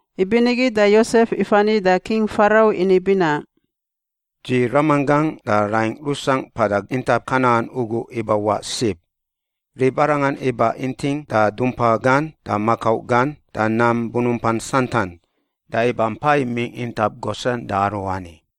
Ibinigi da Yosef ifani da King Farau ini binaꞌ, “Dzi ramanggangꞌ da raingꞌ rusangꞌ mpada intap Kanan ugu ibawaꞌ sib. Ribarangan iba inting da dumpa gan da makau gan da nam bunumpan santan, da iba mpa imingꞌ intap Gosen da aruani.”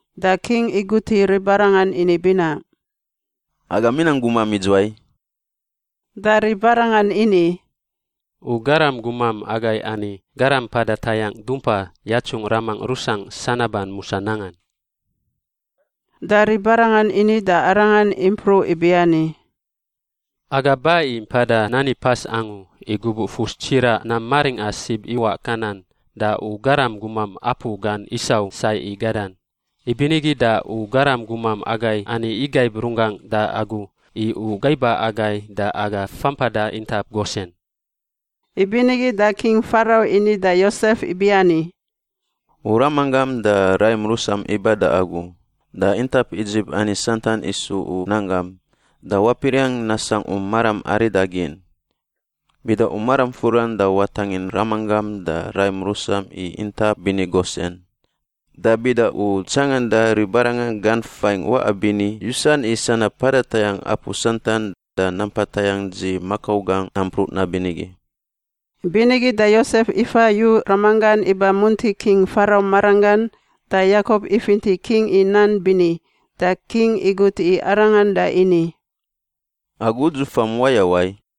Da king iguti ribarangan ini binaꞌ, “Agam inang gumam idzuwai?” Da ribarangan ini, “U garam gumam agai ani garam mpada tayangꞌ dumpa yatsungꞌ ramangꞌ rusangꞌ sanaban musa nangan.” Da ribarangan ini da arangan impruꞌ ibiani, “Aga ba i mpada nani pas angu, i gubuꞌ fus tsiraꞌ nam maringꞌa sib iwaꞌ Kanan da u garam gumam apu gan isau sai i gadan. Ibinigi da u garam gumam agai ani igaib runggangꞌ da agu i u gaiba agai da aga fampada intap Gosen.” Ibinigi da King Farau ini da Yosef ibiani, “U ramanggam da raim rusam iba da agu; da intap Idzip ani santan isu u nanggam da wapiriangꞌ nasangꞌ u maram aridagin. Bida u maram furan da watangin ramanggam da raim rusam i intap bini Gosen. Da bida u tsanganda ribarangan gan fain waꞌa bini yusan i sanab mpada tayangꞌ apu santan da nampa tayangꞌ dzi makau gangꞌ nampruꞌ nabinigi.” Ibinigi da Yosef ifa yu ramanggan iba munti King Farau maranggan. Da Yakop ifinti king i nan bini, da king igut i arangan da ini, “Agu udzufam wayawai?”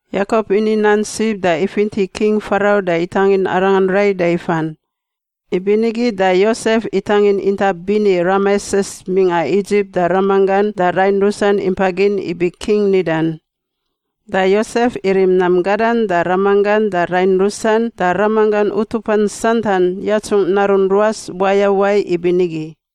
Yakop ini nan sib da ifinti King Farau da itangin arangan rai da ifan. Ibinigi da Yosef itangin intap bini Rameses mingꞌa Idzip da ramanggan da rain rusan impa gin ibi king nidan. Da Yosef irim nam gadan da ramanggan da rain rusan da ramanggan utupan santan yatsungꞌ narun ruas wayawai ibinigi.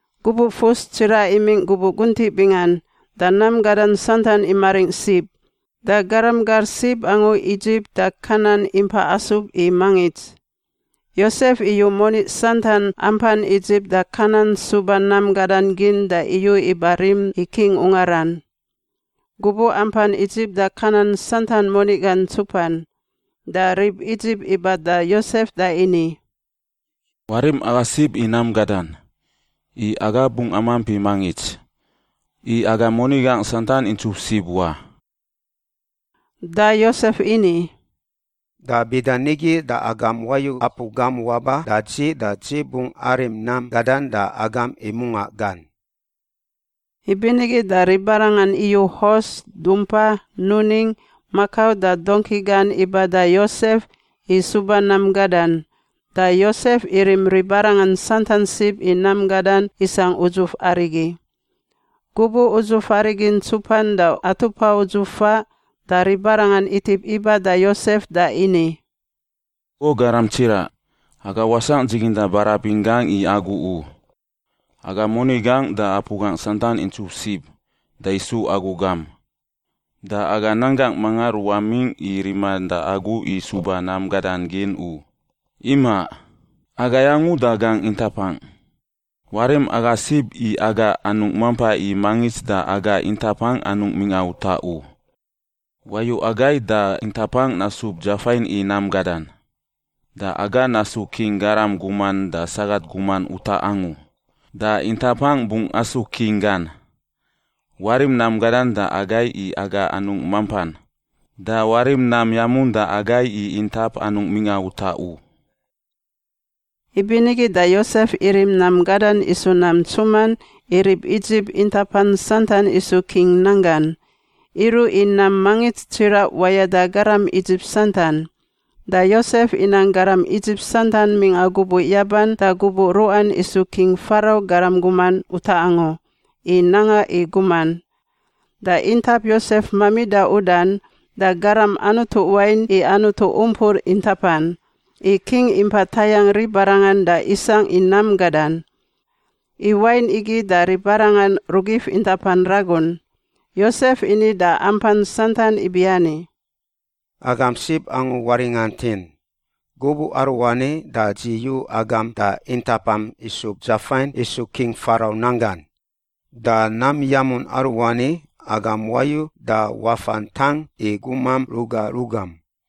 Gubuꞌ fus tsiraꞌ imingꞌ gubuꞌ guntiꞌ bingan da nam gadan santan imaringꞌ sib, da garam gar sib angu Idzip da Kanan impa asub i mangits. Yosef iyu moni santan ampan Idzip da Kanan suba nam gadan gin da iyu iba rim i king ungaran. Gubuꞌ ampan Idzip da Kanan santan moni gan ntsupan, da rib Idzip iba da Yosef da ini, “Warim aga sib i nam gadan, i aga bungꞌ amamp i mangits. I aga moni gangꞌ santan intsup sib wa!” Da Yosef ini, “Da bida nigi da agam wayu apu gam waba da dzi da dzi bungꞌ arim nam gadan da agam i mungaꞌ gan.” Ibinigi da ribarangan iyu hos, dumpa, nuning, makau da dongki gan iba da Yosef i suba nam gadan. Da Yosef irim ribarangan santan sib i nam gadan isangꞌ udzuf arigi. Gubuꞌ udzuf arigi ntsupan da atupa udzuf faꞌ da ribarangan itip iba da Yosef da ini, “O garam tsiraꞌ! Aga wasangꞌ dziginda barabin gangꞌ i agu u. Aga moni gangꞌ da apu gangꞌ santan intsup sib da isu agu gam. Da aga nanggangꞌ mangan ruwamingꞌ i riman da agu i suba nam gadan gin u. Imaꞌ, agai angu da gangꞌ intapangꞌ. Warim aga sib i aga anungꞌ mampa i mangits da aga intapangꞌ mingꞌa utaꞌ u. Wayu agai da intapangꞌ nasub dzafain i nam gadan. Da aga nasu king garam guman da sagat guman utaꞌ angu, da intapangꞌ bungꞌ asu king gan. Warim nam gadan da agai i aga anungꞌ mampan, da warim nam yamun da agai i intap anungꞌ mingꞌa utaꞌ u.” Ibinigi da Yosef irim nam gadan isu nam ntsuman i rib Idzip intapan santan isu king nanggan, iruꞌ i nam mangits tsiraꞌ wayada garam Idzip santan. Da Yosef inang garam Idzip santan mingꞌa gubuꞌ yaban da gubuꞌ ruꞌan isu King Farau garam guman utaꞌ angu i nanga i guman. Da intap Yosef mamida udan, da garam anutu wain i anutu umpur intapan, i king impa tayangꞌ ribarangan da isangꞌ i nam gadan. I wain igi da ribarangan rugif intapan ragun. Yosef ini da ampan santan ibiani, “Agam sib angu waringantin, gubuꞌ aruani da dzi yu agam da intapam isub dzafain isu King Farau nanggan. Da nam yamun aruani, agam wayu da wafa ntang i gumam ruga rugam.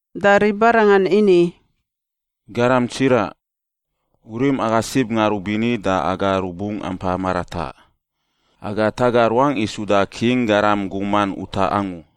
Da ribarangan ini, “Garam tsiraꞌ, u rim aga sib ngarubini, da aga rubungꞌ ampa marataꞌ. Aga taga ruangꞌ i suda king garam guman utaꞌ angu.”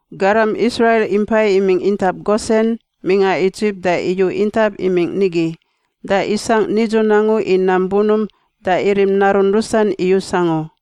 Garam Israil impai imingꞌ intap Gosen mingꞌa Idzip da iyu intap imingꞌ nigi, da isangꞌ nidzun angu i nam bunump da irim narun rusan iyus angu.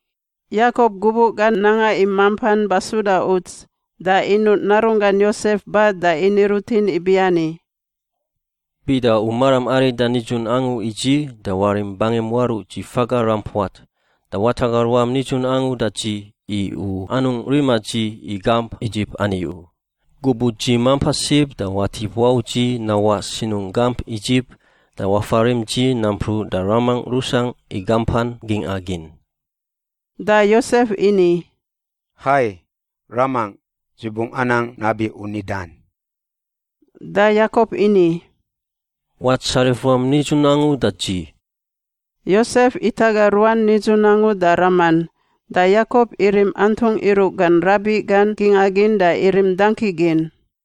Yakop gubuꞌ gan nanga i mampan basuda uts, da inuꞌ narunggan Yosef ba da ini rutin ibiani, “Bida u maram arida nidzun angu i dzi da warim bangim waruꞌ dzi faga rampuat da wataga ruam nidzun angu da dzi i u anungꞌ rima dzi i gamp Idzip ani u, gubuꞌ dzi mampa sib da watip wau dzi nawaꞌ sinungꞌ gamp Idzip da wafarim dzi nampruꞌ da ramangꞌ rusangꞌ i gampan gingꞌa gin.” Da Yosef ini, “Hai, ramangꞌ! Dzi bungꞌ anang nabi u nidan.” Da Yakop ini, “Watsarif ruam nidzun angu da dzi.” Yosef itaga ruan nidzun angu da raman, da Yakop irim antungꞌ iruꞌ gan rabiꞌ gan gingꞌa gin da irim dangki gin.